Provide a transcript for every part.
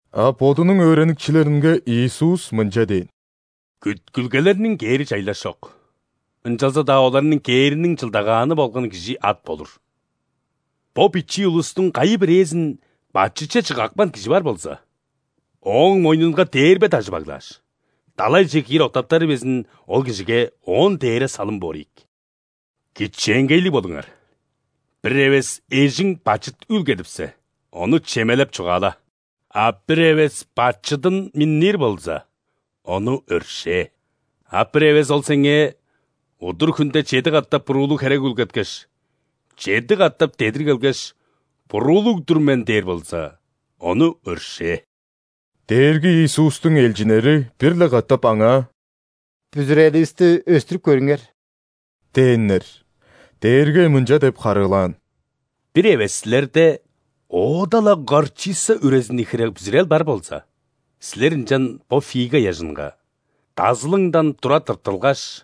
А Бодунуң өөреникчилеринге Иисус мынча дээн: «Күткүлгелерниң кээри чайлаш чок, ынчалза-даа оларның кээриниң чылдагааны болган кижи ат болур! Бо бичии улустуң кайы-бирээзин бачытче чыгапкан кижи бар болза, ооң мойнунга дээрбе дажы баглааш, далайже киир октаптары безин ол кижиге оон дээре салым болур ийик. Кичээнгейлиг болуңар! Бир эвес эжиң бачыт үүлгедипсе, ону чемелеп чугаала, а бир эвес бачыдын миннир болза, ону өршээ. А бир эвес ол сеңээ удур хүнде чеди катап буруулуг херек үүлгеткеш, чеди катап дедир келгеш: „Буруулуг-дур мен“ – дээр болза, ону өршээ». Дээрги Иисустуң элчиннери бир-ле катап Аңаа: «Бүзүреливисти өстүрүп көрүңер» – дээннер. Дээрги мынча деп харыылаан: «Бир эвес силерде оода-ла горчица үрезини хире бүзүрел бар болза, силер ынчан бо фига ыяжынга: „Дазылыңдан тура тырттылгаш,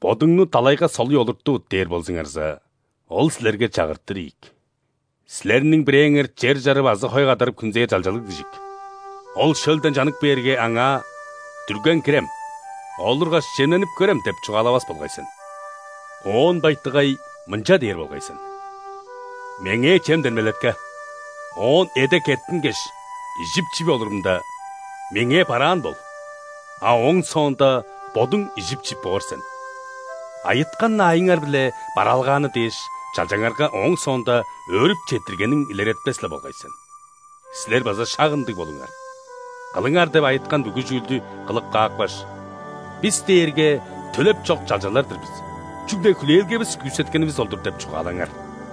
бодуңну далайга солуй олуртувут“ – дээр болзуңарза, ол силерге чагыртыр ийик. Силерниң бирээңер чер чарып азы хой кадарып хүнзээр чалчалыг дижик. Ол шөлден чанып кээрге, аңаа: „Дүрген кирем, олургаш, чемненип көрем“ – деп чугаалавас болгай сен. Оон байтыгай, мынча дээр болгай сен: „Меңээ чемден белетке, оон эде кеттингеш, ижип-чип олурумда, меңээ бараан бол, а ооң соонда бодуң ижип-чип боор сен“. Айыткан аайыңар-биле бараалгааны дээш, чалчаңарга ооң соонда өөрүп четтиргениң илеретпес-ле болгай сен. Силер база шак ындыг болуңар, „кылыңар“ деп айыткан бүгү чүүлдү кылып каапкаш: „Бис дээрге төлеп чок чалчалар-дыр бис, чүгле хүлээлгевис күүсеткенивис ол-дур“ – деп чугаалаңар».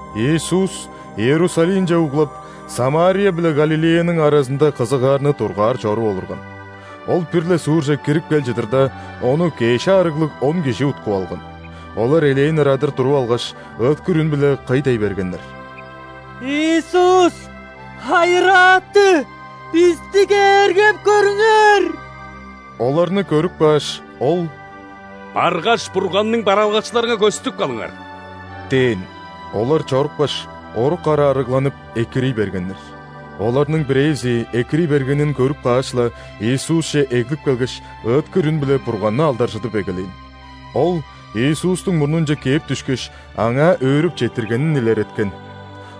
Иисус Иерусалимче углап, Самария биле Галилеяның аразында кызыгаарны дургаар чоруп олурган. Ол бир-ле суурже кирип кел чыдырда, Ону кеш аарыглыг он кижи уткуп алган. Олар элээн ырадыр туруп алгаш, ыыткыр үн-биле кый дей бергеннер: «Иисус, Хайырааты, бисти кээргеп көрүңер!» Оларны көрүп кааш, Ол: «Баргаш, Бурганның бараалгакчыларынга көстүп калыңар» – дээн. Олар чорупкаш, орук ара арыгланып, экирий бергеннер. Оларның бирээзи экирий бергенин көрүп кааш-ла, Иисусче эглип келгеш, ыыткыр үн-биле Бурганны алдаржыдып эгелээн. Ол Иисустуң мурнунче кээп дүшкеш, Аңаа өөрүп четтиргенин илереткен.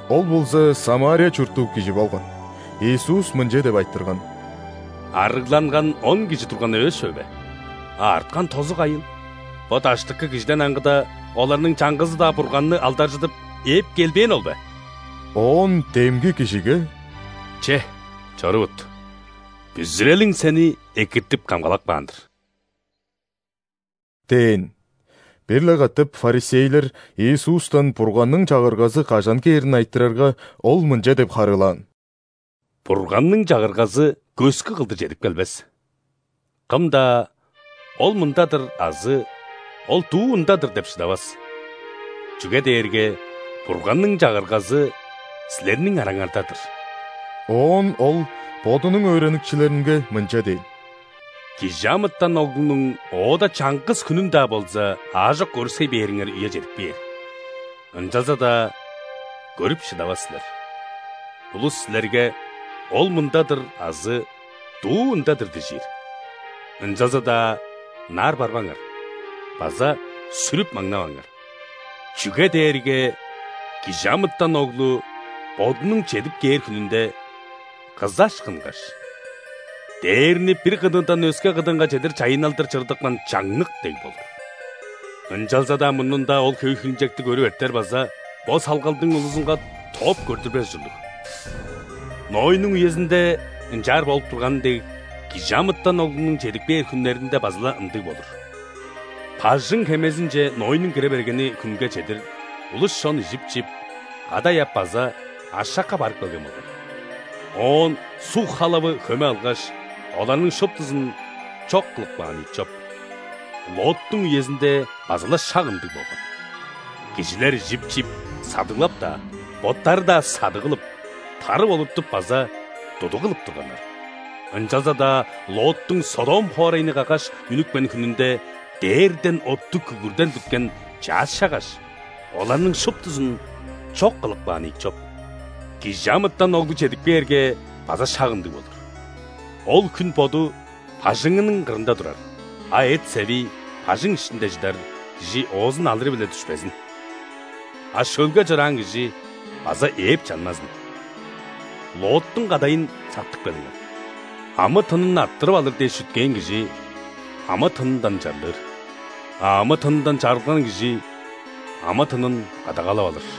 Ол болза ·Самария чурттуг кижи болган. Иисус мынча деп айтырган: «Арыгланган он кижи турган эвес чүве бе? А арткан тозу кайыл? Бо даштыкы кижиден аңгыда, оларның чаңгызы-даа Бурганны алдаржыдып, ээп келбээни ол бе?» Оон демги кижиге: «Че, чорувут, бүзүрелиң сени экиртип-камгалап каан-дыр» – дээн. Бир-ле катап ·фарисейлер Иисустан Бурганның Чагыргазы кажан кээрин айтырарга, Ол мынча деп харыылаан: «Бурганның Чагыргазы көскү кылдыр чедип келбес. Кым-даа: „Ол мында-дыр“ азы: „Ол дуу ында-дыр“ – деп шыдавас, чүге дээрге Бурганның Чагыргазы силерниң араңарда-дыр». Оон Ол Бодунуң өөреникчилеринге мынча дээн: «·Кижи амытан Оглунуң оода чаңгыс хүнүн-даа болза аажок көрүксей бээриңер үе чедип кээр, ынчалза-даа көрүп шыдавас силер. Улус силерге: „Ол мында-дыр“ азы „Дуу ында-дыр“ – дижир, ынчалза-даа ынаар барбаңар база сүрүп маңнаваңар. Чүге дээрге ·Кижи амытан Оглу Бодунуң чедип кээр хүнүнде, кызаш кынгаш, дээрни бир кыдыындан өске кыдыынга чедир чайынналдыр чырыдыпкан чаңнык дег болур. Ынчалза-даа мурнунда Ол хөй хилинчекти көрүп эртер база бо салгалдың улузунга тооп көрдүрбес ужурлуг. Нойнуң үезинде ынчаар болуп турганы дег, ·Кижи амытан Оглунуң чедип кээр хүннеринде база-ла ындыг болур. Бажың-хемезинче Нойнуң кире бергени хүнге чедир улус-чон ижип-чип, кадай ап база ашакка барып келген болгай. Оон суг халавы хөме алгаш, оларның шуптузун чок кылып каан ийик чоп. Лоттуң үезинде база-ла шак ындыг болган. Кижилер ижип-чип, садыглап-даа, боттары-даа садыг кылып, тарып-олуртуп база тудуг кылып турганнар. Ынчалза-даа Лоттуң Содом хоорайны каггаш үнүпкен хүнүнде дээрден оттуг күгүрден бүткен чаъс чаггаш, оларның шуптузун чок кылып каан ийик чоп. ·Кижи амытан Оглу чедип кээрге, база шак ындыг болур. Ол хүн боду бажыңының кырында турар, а эт-севи бажың иштинде чыдар кижи оозун алыры-биле дүшпезин; а шөлге чораан кижи база ээп чанмазын. Лоттуң кадайын сактып келиңер! Амы-тынын арттырып алыр дээш чүткээн кижи – амы-тынындан чарлыр, а амы-тынындан чарылган кижи – амы-тынын кадагалап алыр.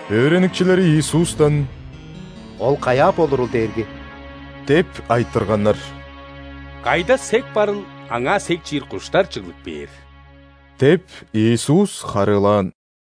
Өөреникчилери Иисустан: «Ол каяа болурул, Дээрги?» – деп айтырганнар. «Кайда сек барыл, аңаа сек чиир куштар чыглып кээр» – деп, Иисус харыылаан.